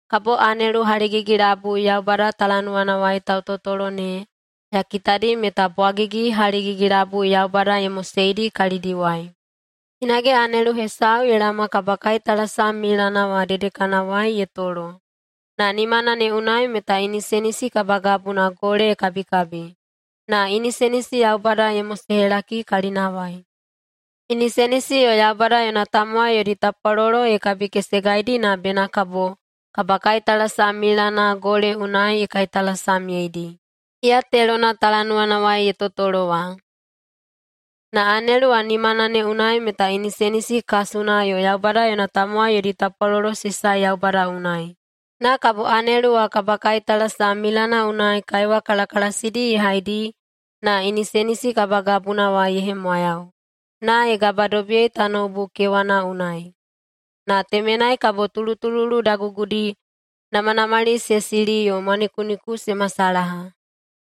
Kabo anelu haligigi-labui Yaubada talanuwanawai tautotolo ne ya kitadi meta bwagigi haligigi-labui Yaubada ye moseidi kalidiwai. Hinage anelu hesau ye laoma kabakaitalasam milana wa dedekanawai ye tolo, na nimana ne unai meta inisenisi kabagabuna gole ye kabikabi, na inisenisi Yaubada ye mosehelaki kalinawai. Inisenisi yo Yaubada yona tamowai yodi tapwalolo ye kabikesegaidi na bena kabo kabakaitalasam milana gole unai ye kaitalasamyeidi, iya telona talanuwanawai ye totolo wa. Na anelu wa nimana ne unai meta inisenisi kasuna yo Yaubada yona tamowai yodi tapwalolo se sae Yaubada unai. Na kabo anelu wa kabakaitalasam milana unai kaiwa kalakalasidi ye haidi na inisenisi kabagabuna wa ye hemwayau, na ye gabadobiyei tanoubu kewana unai. Na temenai kabo tulutululu dagugudi, namanamali se sili yo mwanikuniku se masalaha.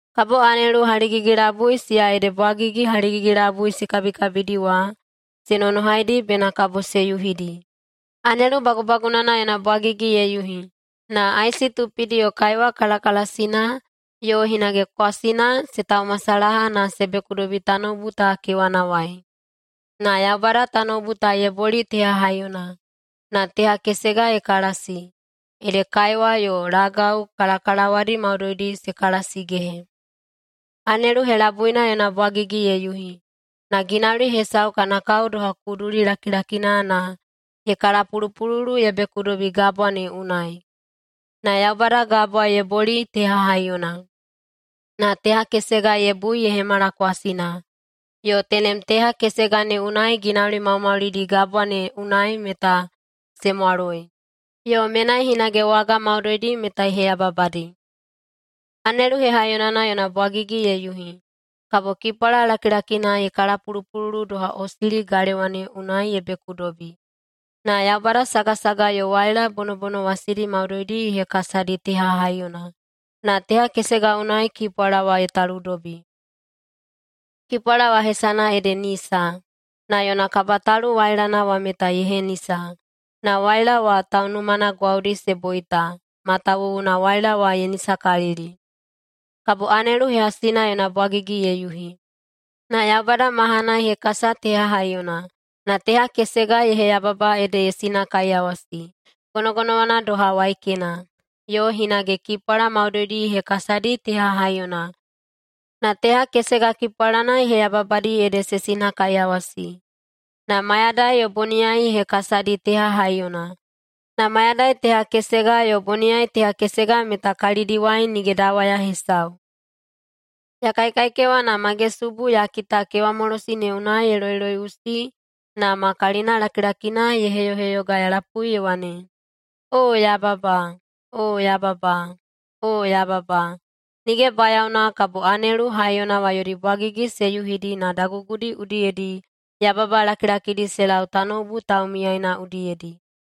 Kabo anelu haligigi-labui siya ede bwagigi haligigi-labui se kabikabidi wa, se nonohaidi bena kabo se yuhidi. Anelu bagubagunana yona bwagigi ye yuhi, na aisi tupidi yo kaiwa kalakalasina yo hinage kwasina se taumasalaha na se bekudobi tanoubu ta kewanawai. Na Yaubada tanoubu ta ye boli teha haiyona, na teha kesega ye kalasi, ede kaiwa yo lagau kalakalawadi maudoidi se kalasigehe. Anelu helabuina yona bwagigi ye yuhi, na ginauli hesau kana kao doha kuduli lakilakina na ye kalapulupululu ye bekudobi gabwa ne unai. Na Yaubada gabwa ye boli teha haiyona, na teha kesega ye bui ye hemala kwasina, yo tenem teha kesega ne unai ginauli maumaulidi gabwa ne unai meta se mwaloi, yo menai hinage waga maudoidi meta ye heyababadi. Anelu hehaiyonana yona bwagigi ye yuhi, kabo kipwala lakilakina ye kalapulupululu doha osili galewa ne unai ye bekudobi. Na Yaubada sagasaga yo waila bonobonowasidi maudoidi ye hekasadi teha haiyona, na teha kesega unai kipwala wa ye taludobi. Kipwala wa hesana ede Nisa. Na yona kabatalu wailana wa meta ye henisa, na waila wa taunumana gwaudi se boita, matawuwuna waila wa ye nisakalili. Kabo anelu hehasina yona bwagigi ye yuhi. Na Yaubada mahana ye hekasa teha haiyona, na teha kesega ye heyababa ede ye sinakaiyawasi. Gonogonowana doha waikena. Yo hinage kipwala maudoidi ye hekasadi teha haiyona, na teha kesega kipwalana ye heyababadi ede se sinakaiyawasi. Na mayadai yo boniyai ye hekasadi teha haiyona, na mayadai teha kesega yo boniyai teha kesega meta kalidiwai nige dawaya hesau. Ya kaikaikewa, na magesubu ya kita kewamolosi ne unai ye loiloiꞌusi na ma kalinalakilakina ye heyoheyoga ya lapui ye wane, “Oo yababa! Oo yababa! Oo yababa! Nige bayaona kabo anelu haiyona wa yodi bwagigi se yuhidi na dagugudi udiyedi yababa lakilakidi se lau tanoubu taumiyaina udiyedi!”